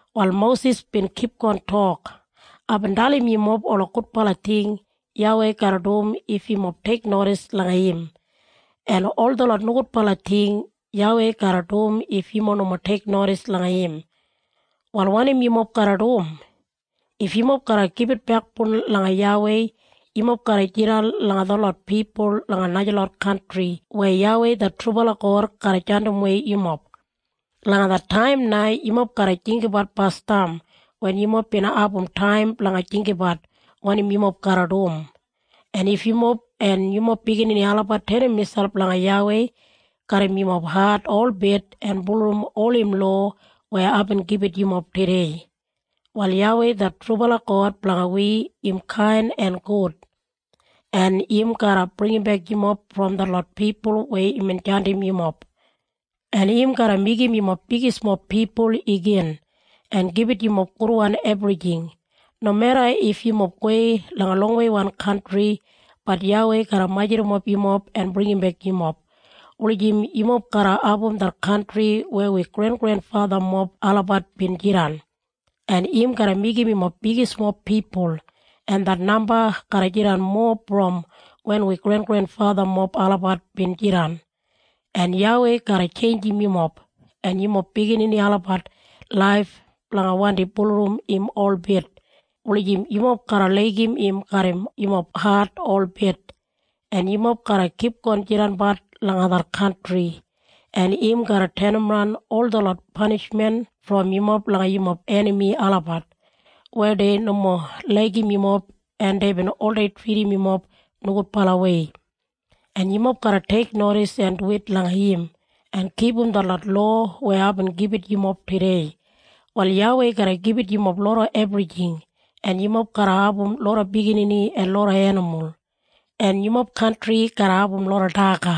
Wal Mosis bin kipgon tok, “Aibin dalim yumob ola gudbala ting YAWEI garra dum if yumob teiknodis langa im, en ol detlot nogudbala ting YAWEI garra dum if yumob nomo teiknodis langa im. Wal wanim yumob garra dum? If yumob garra gibit bekboun langa YAWEI yumob garra jidan langa detlot pipul langa najalot kantri weya YAWEI det trubala God garra jandimwei yumob. Langa det taim na yumob garra jinggabat basdam wen yumob bin abum taim blanga jinggabat wanim yumob garra dum. En if yumob en yumob biginini olabat tenim miselp langa YAWEI garram yumob hat holbit en bulurrum ol im lowa weya aibin gibit yumob tudei, wal YAWEI det trubala God blanga wi im kain en gud, en im garra bringimbek yumob brom detlot pipul weya imbin jandim yumob. En im garra meigim yumob bigismob pipul igin, en gibit yumob gudwan ebrijing. Nomeda if yumob gowei langa longweiwan kantri, bat YAWEI garra majurrumap yumob en bringimbek yumob, wulijim yumob garra abum det kantri weya wi grengrenfathamob olabat bin jidan, en im garra meigim yumob bigismob pipul, en det namba garra jidan mowa brom wen wi grengrenfathamob olabat bin jidan. En YAWEI garra tjeinjim yumob en yumob biginini olabat laif blanga wandi bulurrum im holbit, wulijim yumob garra laigim im garram yumob hat holbit, en yumob garra kipgon jidanbat langa det kantri. En im garra tenimran ol detlot panishmen brom yumob langa yumob enami olabat, weya dei nomo laigim yumob en deibin oldei tridim yumob nogudbalawei. En yumob garra teiknodis en duwit langa im en kipum detlot lowa weya aibin gibit yumob tudei. Wal YAWEI garra gibit yumob loda ebrijing, en yumob garra abum loda biginini en loda enimul, en yumob kantri garra abum loda daga.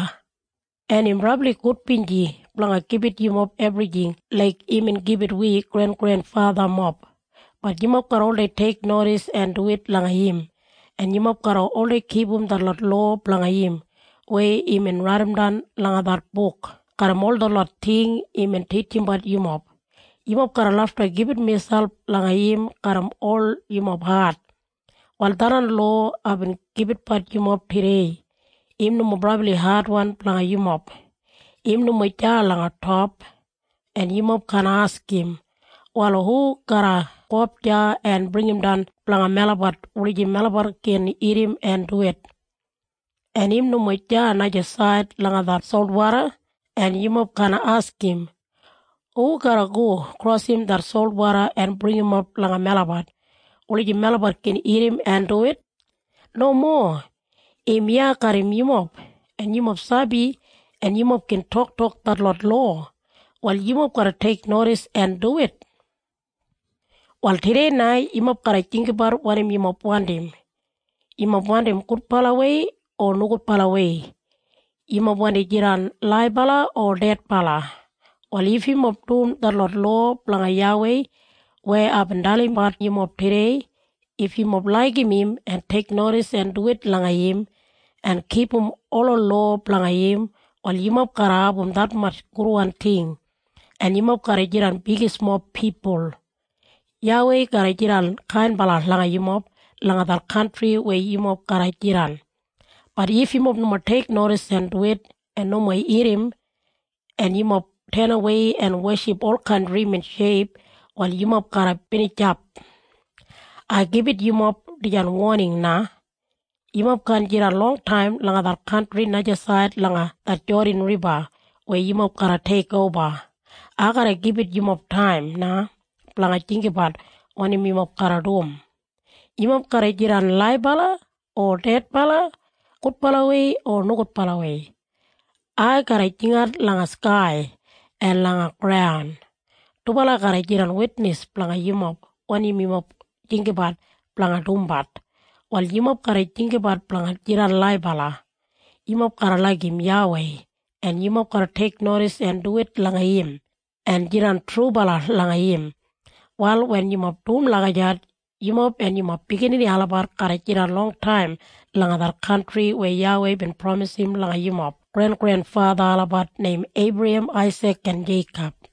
En im brabli gudbinji blanga gibit yumob ebrijing laik imbin gibit wi grengrenfathamob. Bat yumob garra oldei teiknodis en duwit langa im, en yumob garra oldei kipum detlot lowa blanga im weya imbin raidimdan langa det buk garram ol detlot ting imbin titjimbat yumob. Yumob garra lafta gibit miselp langa im garram ol yumob hat. “Wal tharran lowa aibin gibitbat yumob tudei, im nomo brabli adwan blanga yumob. Im nomo deya langa top, en yumob kaan askim, ‘Wal hu garra gowap deya en bringimdan blanga melabat, wulijim melabat gin irrim en duwit?’ En im nomo deya najasaid langa det solwoda, en yumob kaan askim, ‘Hu garra go krosim det solwoda en bringimap langa melabat, wulijim melabat gin irrim en duwit?’ Nomo. Im iya garram yumob, en yumob sabi en yumob gin toktok detlot lowa. Wal yumob garra teiknodis en duwit. “Wal tudei na yumob garra jinggabat wanim yumob wandim. Yumob wandim gudbalawei o nogudbalawei? Yumob wandim jidan laibala o dedbala? Wal if yumob dum detlot lowa blanga YAWEI weya aibin dalimbat yumob tudei, if yumob laigim im, en teiknodis en duwit langa im, en kipum ola lowa blanga im, wal yumob garra abum detmatj gudwan ting, en yumob garra jidan bigismob pipul. YAWEI garra jidan kainbala langa yumob langa det kantri weya yumob garra jidan. Bat if yumob nomo teiknodis en duwit, en nomo irrim, en yumob tenawei en weship olkain drimin sheip, wal yumob garra binijap. Ai gibit yumob dijan woning na. Yumob kaan jidan longtaim langa det kantri najasaid langa det Jodan Riba weya yumob garra teikoba. Ai garra gibit yumob taim na blanga jinggabat wanim yumob garra dum. Yumob garra jidan laibala o dedbala, gudbalawei o nogudbalawei? Ai garra jingat langa skai en langa graun. Dubala garra jidan witnis blanga yumob wanim yumob jinggabat blanga dumbat. Wal yumob garra jinggabat blanga jidan laibala. Yumob garra laigim YAWEI, en yumob garra teiknodis en duwit langa im, en jidan trubala langa im. Wal wen yumob dum lagijat, yumob en yumob biginini olabat garra jidan longtaim langa det kantri weya YAWEI bin pramisim langa yumob grengrenfatha olabat neim Eibrahem, Aisik en Jeikob.”